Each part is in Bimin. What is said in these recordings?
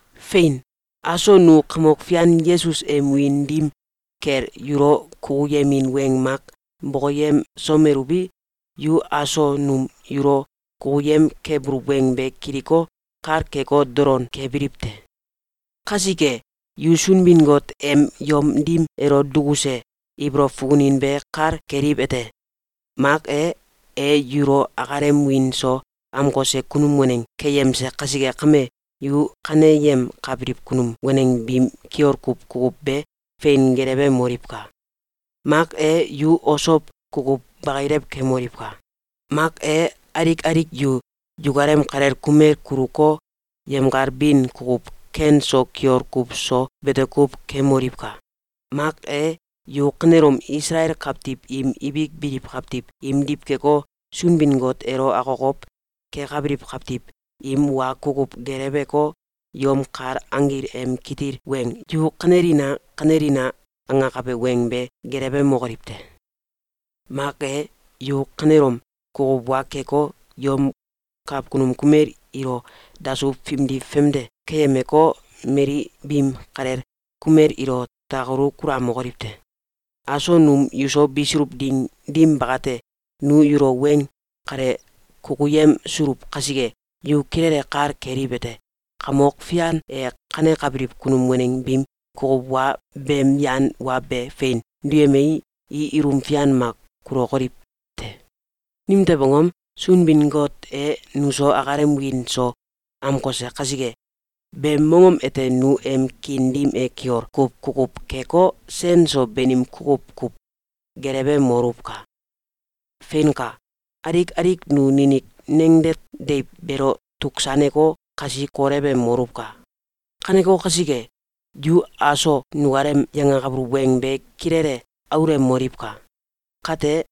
Fein! Aso nu Kamok Fian Yesus em wiin dim kel yulo kukuyemin weng mak bokoyemsomeluwi, yu aso num yulo kukuyem kebuluw weng be kiliko, kal keko, dolon kebiliw te. Kasike, yu Sunbin-Got em yom dim elo dukuse ibolow fukunin be kal keliwete: Mak e, e yulo akalem wiin so amkose kunum waneng keyemse kasike kame, yu kaneyemkabiliw kunum waneng biim kiol kuw kukuw be fein gelewemoliwka! Mak e, Yu osow kukuw bakilew kemoliwka! Mak e, alik alik yu yukalem kalel kumel kuluko, yemkal bin kukuw ken so kiol kuw so bete kuw kemoliwka! Mak e, yu kanelom Isalael kawtiw im ibik biliw kawtiw imdiw keko, Sunbin-Got elo akokow kekabiliw kawtiw im wa kukuw geleweko, yom kal anggil em kitil weng “Yu kanelina! Kanelina!”, angakabe weng be gelewemokoliw te! Mak e, yu kanelom kukuw wa keko, yom kakunum kumel ilo dasuw fimdi famde keyemeko, mali biim kalel kumel ilo takalu kulamokoliw te! Aso num yuso bisuluw ding dim bakate, nu yulo weng kale kukuyemsuluw kasike, yu kilele kal keliwete: Kamok Fian e kanekabiliw kunum waneng biim kukuw wa beem yan wa be fein duyemei, i ilum fian mak kulokoliw te. Nimtew angom? Sunbin-Got e nuso akalem wiin so amkose kasike. Beem mongom ete nu em kiin dim e kiol kuw kukuw keko, sen so banim kukuw kuw gelewemoluwka! Feinka! Alik alik nu ninik nangdet deiw beelo tuksaneko, kasi kolewemoluwka! Kaneko kasike, yu aso nukalem yangakabuluw weng be kilele aulemoliwka! Kate,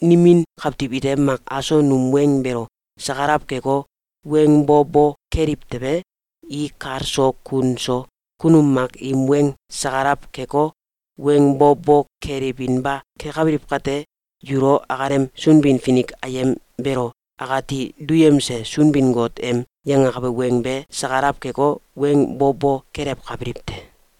nimin kawtiw ite mak aso num weng beelo sakalaw keko, weng bo bo keliw tewe, i kal so kun so kunum mak im weng sakalaw keko, weng bo bo kelewinba kekabiliw kate, yulo akalem Sunbin-Finik ayem beelo akati duyemse Sunbin-Got em yangakabe weng be sakalaw keko, weng bo bo kelewkabiliw te.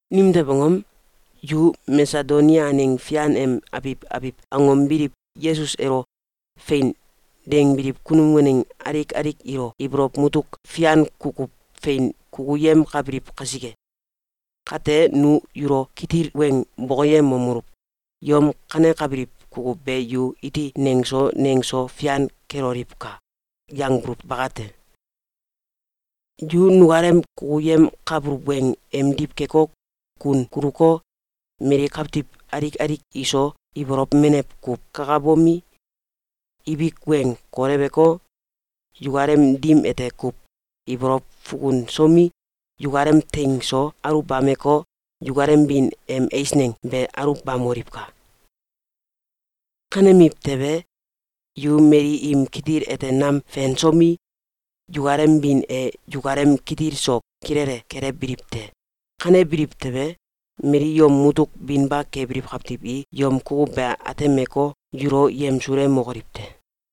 Nimtew angom? Yu Masedonia aneng fian em abiw abiw angom biliw Yesus elo “Fein!”, dangbiliw kunum waneng alik alik ilo ibolow mutuk fian kukuw fein kukuyemkabiliw kasike. Kate, nu yulo kitil weng bokoyemomeluw: “Yom kanekabiliw kukuw be yu iti nengso nengso fian keloliwka!”, yangbuluw bakate! Yu nukalem kukuyemkabuluw weng emdiw keko, kun kuluko, mali kawtiw alik alik iso ibolow menew kuw kakabomi, ibik weng koleweko, yukalem dim ete kuw ibolow fukunsomi, yukalem teing so aluwbameko, yukalem bin em eisneng be aluwbamoliwka! Kanemiw tewe, yu mali im kitil ete nam fensomi, yukalem bin e yukalem kitil so kilele kelewbiliw te. Kanebiliw tewe, mali yom mutuk binba kebiliw kawtiw i yom kukuw be atemeko, yulo yemsulemokoliw te.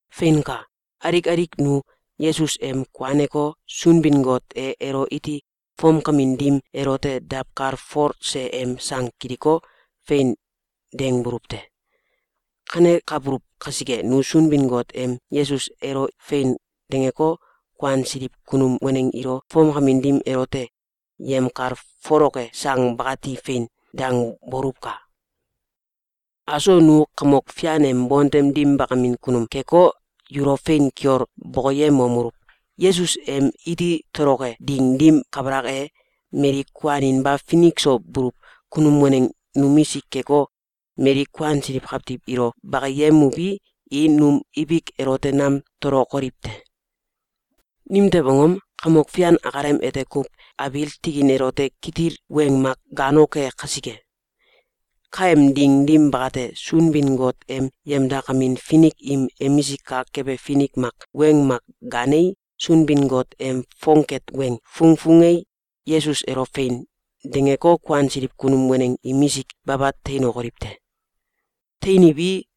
Feinka! Alik alik nu Yesus em kuaneko, Sunbin-Got e elo iti fomkamin dim elote dawkalfolse em sang kiliko, “Fein!”, dangbuluw te. Kanekabuluw kasike, nu Sunbin-Got em Yesus elo “Fein!”, dangeko, kuansiliw kunum waneng ilo fomkamin dim elote yemkalfoloke sang bakati “Fein!”, dangboluwka! Aso nu Kamok Fian em bontem dim bakamin kunum keko, yulo fein kiol bokoyemomeluw: Yesus em iti toloke ding dim kabalak e, mali kuaninba finik so buluw kunum waneng numisik keko, mali kuansiliw kawtiw ilo bakiyemuwi, i num ibik elote nam tolokoliw te. Nimtew angom? Kamok Fian akalem ete kuw abiil tikin elote kitil weng mak gaanoke kasike. Kaem ding dim bakate, Sunbin-Got em yemdakamin finik im emisik kak kebe finik mak weng mak gaanei, Sunbin-Got em fongket weng fungfungei, Yesus elo “Fein!”, dangeko, kuansiliw kunum waneng imisik baba teinokoliw te. Teiniwi,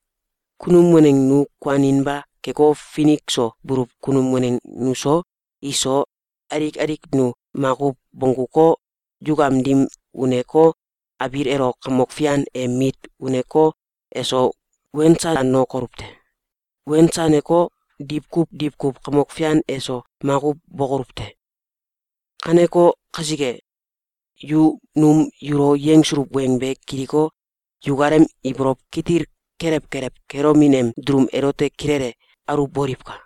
kunum waneng nu kuaninba keko, finik so buluw kunum waneng nuso, iso, alik alik nu makuw bongguko, yukam dim uneko, abiil elo Kamok Fian em mit uneko, eso wensanokoluw te. Wensaneko, diwkuw diwkuw Kamok Fian eso makuw bokoluw te. Kaneko kasike, yu num yulo yangsuluw weng be kiliko, yukalem ibolow kitil kelew kelew kelomin em dulum elote kilele aluwboliwka!